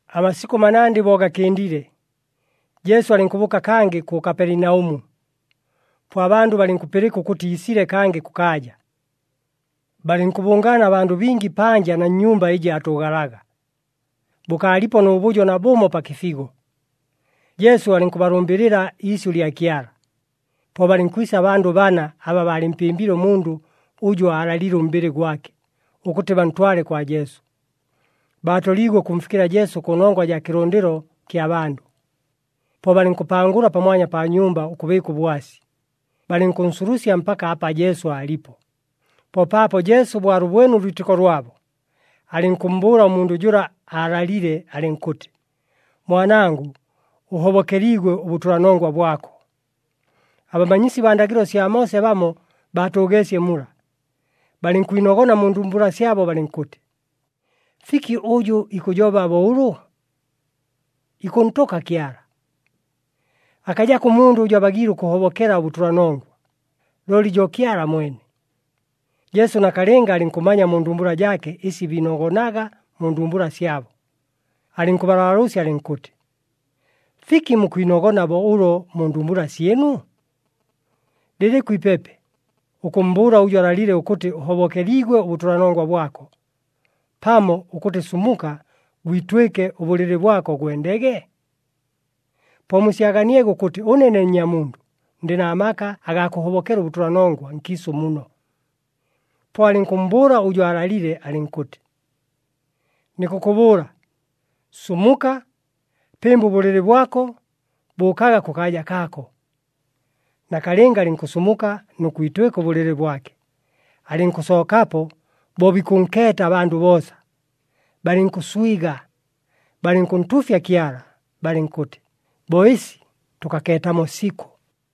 Amasikʉ manandɨ bo gakɨndile, Jesu alɨnkʉbʉʉka kangɨ kʉ Kapelinaʉmu, po abandʉ balɨnkʉpɨlɨka ʉkʉtɨ iisile kangɨ kʉkaaja. Balɨnkʉbʉngaana abandʉ bingi panja na nnyumba ɨjɨ aatʉʉgalaga, bʉkaalipo nʉ bʉjo nabʉmo pa kɨfigo. Jesu alɨnkʉbalʉmbɨlɨla iisyʉ lya Kyala. Po balɨnkwisa abandʉ bana aba baalɨmpɨmbile ʉmundʉ ʉjʉ aalalile ʉmbɨlɨ gwake, ʉkʉtɨ bantwale kwa Jesu. Baatoliigwe ʉkʉmfikɨla Jesu kʉnongwa jaa kɨlʉndɨlo kya bandʉ. Po balɨnkʉpangʉla pamwanya pa nyumba ʉkʉbɨɨka ʉbwasi. Balɨnkʉnsulusya mpaka apa Jesu aalipo. Po paapo Jesu bo alʉbwene ʉlwitɨko lwabo, alɨnkʉmmbʉʉla ʉmundʉ jʉla aalalile, alɨnkʉtɨ, “Mwanangʉ, ʉhobokeliigwe ʉbʉtʉlanongwa bwako.” Abamanyisi baa ndagɨlo sya Moose bamo baatʉʉgeesye mula, balɨnkwinogona mu ndumbula syabo, balɨnkʉtɨ, “Fiki ʉjʉ ikʉjoba bo ʉlʉ? Ikʉntʉka Kyala! Akajako ʉmundʉ ʉjʉ abagiile ʉkʉhobokela ʉbʉtʉlanongwa, looli jo Kyala mwene!” Jesu nakalɨnga alɨnkʉmanya mu ndumbula jaake ɨsi biinogonaga mu ndumbula syabo, alɨnkʉbalaalʉʉsya alɨnkʉtɨ, “Fiki mukwinogona bo ʉlo mu ndumbula syɨnu? Lɨlɨkʉ ipepe, ʉkʉmmbʉʉla ʉjʉ alalile ʉkʉtɨ, ‘Ʉhobokeliigwe ʉbʉtʉlanongwa bwako,’ pamo ʉkʉtɨ, ‘Sumuka gwitwɨke ʉbʉlɨlɨ bwako, gwendege?’ Po musyaganiege ʉkʉtɨ ʉne ne Nnyamundʉ ndɨ na maka agaa kʉhobokela ʉbʉtʉlanongwa nkiisʉ muno...” Po alɨnkʉmmbʉʉla ʉjʉ aalalile, alɨnkʉtɨ, “Nikʉkʉbʉʉla, sumuka, pɨmba ʉbʉlɨlɨ bwako, bʉʉkaga kʉkaaja kaako.” Nakalɨnga alɨnkʉsumuka nʉ kwitwɨka ʉbʉlɨlɨ bwake, alɨnkʉsookapo bo bikʉnkeeta abandʉ boosa. Balɨnkʉswiga, balɨnkʉntuufya Kyala, balɨnkʉtɨ, “Bo ɨsi tʉkakeetamo sikʉ!”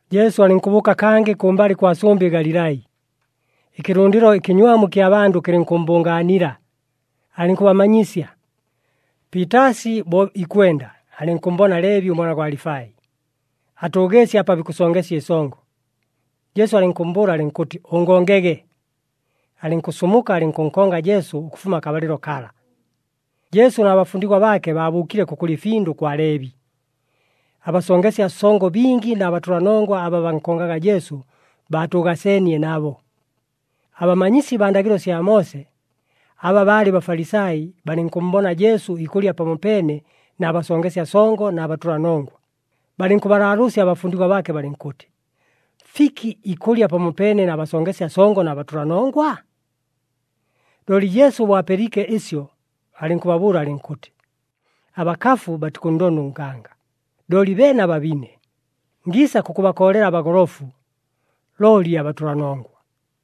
Jesu alɨnkʉbʉʉka kangɨ kʉmbalɨ kwa sʉmbɨ Galilai. Ɨkɨlʉndɨlo ɨkɨnywamu ɨkya bandʉ kɨlɨnkʉmmbʉngaanila, alɨnkʉbamanyisya. Piitaasi bo ikwenda, alɨnkʉmmbona Leebi, ʉmwana gwa Alifai, atʉʉgeesye apa bikʉsongesya ɨsongo. Jesu alɨnkʉmmbʉʉla alɨnkʉtɨ, “Ʉngongege!” Alɨnkʉsumuka, alɨnkʉnkonga Jesu ʉkʉfuma akabalɨlo kala. Jesu na bafundigwa baake baabʉʉkile kʉkʉlya ɨfindʉ kwa Leebi. Abasongesya songo bingi na batʉlanongwa aba bankongaga Jesu, baatʉʉgaseenie nabo. Abamanyisi baa ndagɨlo sya Moose, aba baalɨ Bafalisai, balɨnkʉmmbona Jesu ikʉlya pamopeene na basongesya songo na batʉlanongwa, balɨnkʉbalaalʉʉsya abafundigwa baake, balɨnkʉtɨ, “Fiki ikʉlya pamopeene na basongesya songo na batʉlanongwa?” Looli Jesu bo apɨliike ɨsyo, alɨnkʉbabʉʉla alɨnkʉtɨ, “Abakafu batikʉnndonda ʉnganga, looli beene ababine! Ngiisa kʉkʉbakoolela abagolofu, looli abatʉlanongwa.”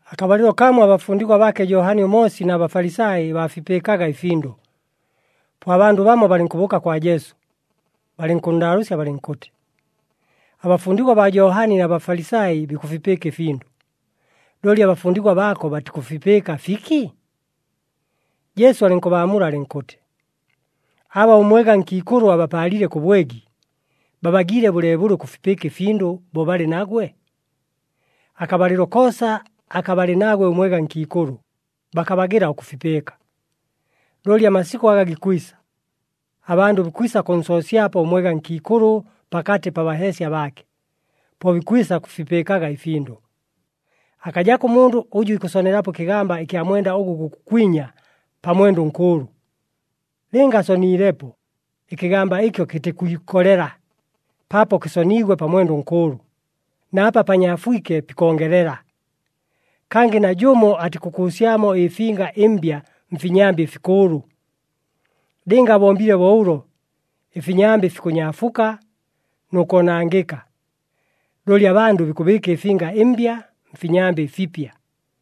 Akabalɨlo kamo abafundigwa baake Johani ʉMoosi na Bafalisai baafipɨɨkaga ɨfindʉ. Po abandʉ bamo balɨnkʉbʉʉka kwa Jesu, balɨnkʉnndaalʉʉsya balɨnkʉtɨ, “Abafundigwa baa Johani na Bafalisai bikʉfipɨɨka ɨfindʉ, looli abafundigwa baako batikʉfipɨɨka, fiki?” Jesu alɨnkʉbaamula alɨnkʉtɨ, “Aba ʉmwega nkiikʉlʉ abapaalile kʉ bwegi, babagiile bʉleebʉle ʉkʉfipɨɨka ɨfindʉ bo balɨ nagwe? Akabalɨlo koosa aka balɨ nagwe ʉmwega nkiikʉlʉ, bakabagɨla ʉkʉfipɨɨka. Looli amasikʉ aga gikwisa, abandʉ bikwisa kʉnsoosyapo ʉmwega nkiikʉlʉ pakatɨ pa baheesya baake. Po bikwisa kʉfipɨɨkaga ɨfindʉ. “Akajako ʉmundʉ ʉjʉ ikʉsonelapo ɨkɨgamba ɨkya mwenda ʉgʉ gukʉkwinya pa mwenda ʉnkʉʉlʉ. Lɨnga asoniilepo, ɨkɨgamba ɨkyo kɨtikwikolela, paapo kɨsoniigwe pa mwenda ʉnkʉʉlʉ, na apa panyaafwike pikongelela. Kangɨ najʉmo atikʉkʉʉsyamo ɨfinga ɨmbya mfinyambɨ ɨfikʉʉlʉ. Lɨnga abombile bo ʉlo, ɨfinyambɨ fikʉnyaafuka nʉ koonangɨka. Looli abandʉ bikʉbɨɨka ɨfinga ɨmbya mfinyambɨ ɨfipya.”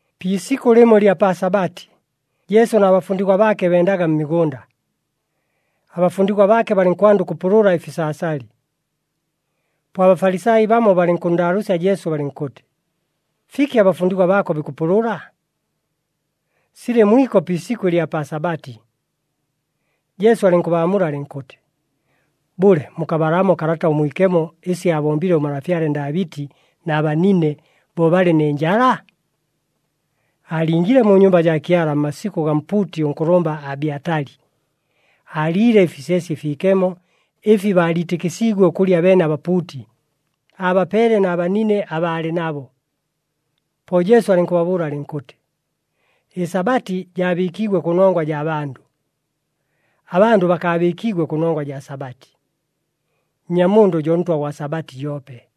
Pi isikʉ lɨmo ɨlya pa Sabati, Jesu na bafundigwa baake bendaga mmigʉnda. Abafundigwa baake balɨnkwanda ʉkʉpʉlʉla ɨfisaasali. Po aBafalisai bamo balɨnkʉnndaalʉʉsya Jesu, balɨnkʉtɨ, “Fiki abafundigwa baako bikʉpʉlʉla? Silɨ mwiko pi isikʉ ɨlya pa Sabati!” Jesu alɨnkʉbaamula alɨnkʉtɨ, “Bʉle, mukabalamo Kalata ʉMwikemo ɨsi aabombile ʉmalafyale Ndaabɨti na banine bo balɨ nɨ njala? Aalingiile mu nyumba jaa Kyala mmasikʉ gaa mpuuti ʉnkʉlʉmba Abyatali. Aaliile ɨfisyesye ɨfiikemo ɨfi baaliitɨkɨsiigwe ʉkʉlya beene abapuuti, aabapeele na banine aba aalɨ nabo.” Po Jesu alɨnkʉbabʉʉla alɨnkʉtɨ, “ƗSabati jaabɨɨkiigwe kʉnongwa jaa bandʉ, abandʉ bakaabɨɨkiigwe kʉnongwa jaa Sabati. Nnyamundʉ jo Ntwa gwa Sabati joope.”